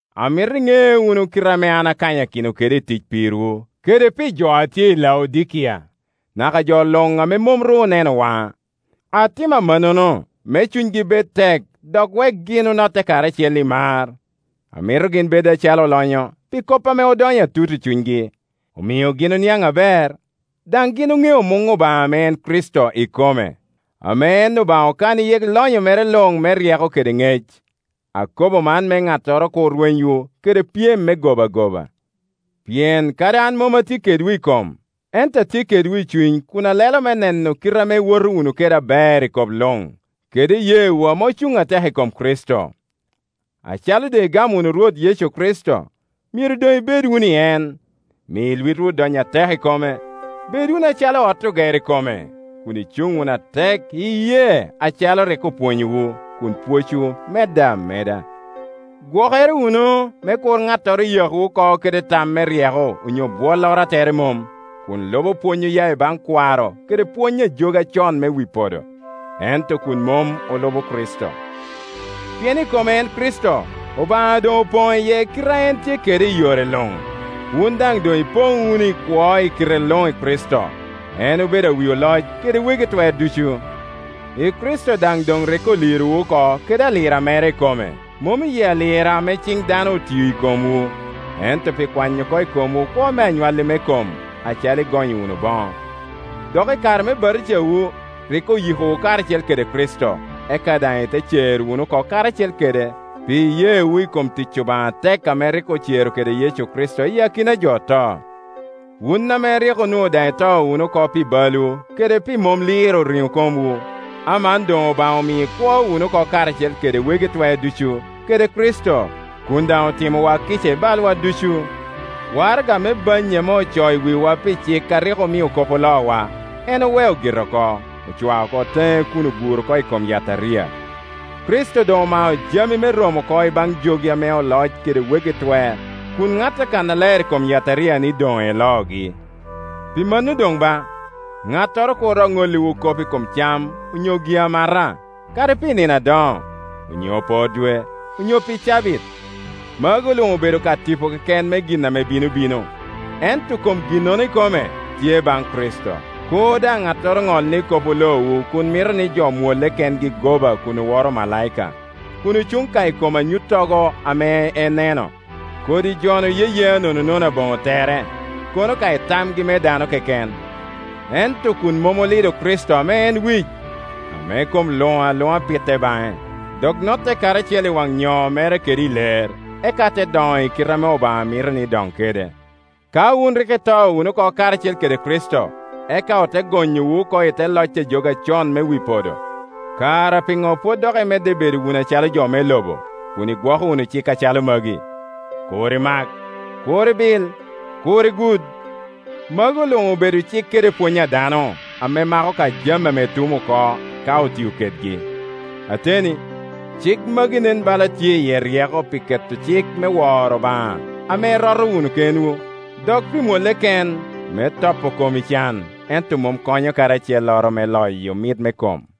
Amito iŋe wunu kite ame an akanyakino kede i tic pirwu kede pi jo a tye i Laodikia, naka jo luŋ ame mom ru oneno waŋa. Atimo amannono me cunygi bed tek dok wek gin onotte karacel i mar. Amito gin bed acalo olonyo pi kop ame odonyo atut i cunygi, omio gin oniaŋ aber, daŋ gin oŋeo muŋ Obaŋa ame en Kricito ikome, ame en Obaŋa okano iye lonyo mere luŋ me ryeko kede ŋec. Akobo man me ŋattoro kur rwenywu kede pyem me goba goba. Pien kadi an mom atye kedwu i kom, ento atye kedwu i cuny kun alelo me neno kite ame iwoto wunu kede aber i kop luŋ, kede iyeewu ame ocuŋ atek i kom Kricito. Acalo doŋ igamo wunu Rwot Yecu Kricito, myero doŋ ibed wunu i en. Mi Iwitwu dony atek i kome, bed wunu acalo ot ogero i kome, kun icuŋ wunu atek i iyee acalo rik opwonyowu, kun pwocwu medde ameda. Gwokere wunu me kur ŋattoro yakwu oko kede tam me ryeko onyo bwolloro a tere mom, kun lubo pwony oya i baŋ kwaro kede pwony ajogi acon me wi podo, ento kun mom olubo Kricito. Pien i kome en Kricito, Obaŋa doŋ opoŋo iye kite a en tye kede i yore luŋ, wun daŋ doŋ ipoŋ wunu i kwo i kite luŋ i Kricito. En obedo awi oloc kede wegi twer ducu. I Kricito daŋ doŋ rik olirowu oko kede alira mere ikome; mom iyi alira ame ciŋ dano otio i komwu, ento pi kwanyo oko i komwu kwo me anywalli me kom, acalo igonyo wunu boŋo. Dok i kare me batijawu rik oyikowu karacel kede Kricito, eka daŋ ite cer wunu oko karacel kede pi iyeewu i kom tic Obaŋa atek ame rik ocero kede Yecu Kricito iyi akinajo oto. Wun ame rik onwoŋo daŋ ito wunu oko pi balwu kede pi mom liro riŋo komwu, aman doŋ Obaŋa omio ikwo wunu oko karacel kede wegi twer ducu. Kede Kricito, kun daŋ otimowa kica i balwa ducu. Waraga me bannyi ame ocoo i wiwa pi cik a rik omio kop oloowa, en oweo gire oko; ocwao oko teŋe kun oguro oko i kom yataria. Kricito doŋ omao jami me romo oko i baŋ jogi ame oloc kede wegi twer, kun ŋatte kannaler i kom yataria ni doŋ eloogi. Pi mano doŋ ba, ŋattoro kur dok ŋolliwu kop i kom cam onyo gi-amata, kadi pi nino adoŋo, onyo por dwe, onyo pi cabit. Magu luŋ obedo ka tipo keken me gin ame bino bino, ento kom ginnono ikome tye baŋ Kricito. Kur daŋ ŋattoro ŋol ni kop oloowu kun mito ni jo mwolle kengi goba kun oworo omalaika, kun ocuŋ ka i kom anyuttogo ame eneno. Kodi jo-nu yeyea nononono aboŋo tere, kono ka i tamgi me dano keken, ento kun mom olido Kricito ame en wic, ame kom luŋ aluŋa pitte baŋe, dok notte karacel i waŋ nyoo mere kede i ler, eka te doŋo i kite ame Obaŋa mito ni doŋ kede. Ka wun rik ito wunu oko karacel kede Kricito, eka ote gonyowu oko i te loc a jogi acon me wi podo, kara piŋo pwod dok imedde bedo wunu acalo jo me lobo, kun igwoko wunu cik acalo magi? “Kur imak, kur ibil, kur igud.” Magu luŋ obedo cik kede pwony a dano, ame mako ka jami ame tum oko ka otio kedgi. Ateni, cik magi nen bala tye iye ryeko pi keto cik me woro Obaŋa ame iroto wunu kenwu, dok pi mwolle ken, me topo kom i can; ento mom konyo kadi acelloro me loyo mit me kom.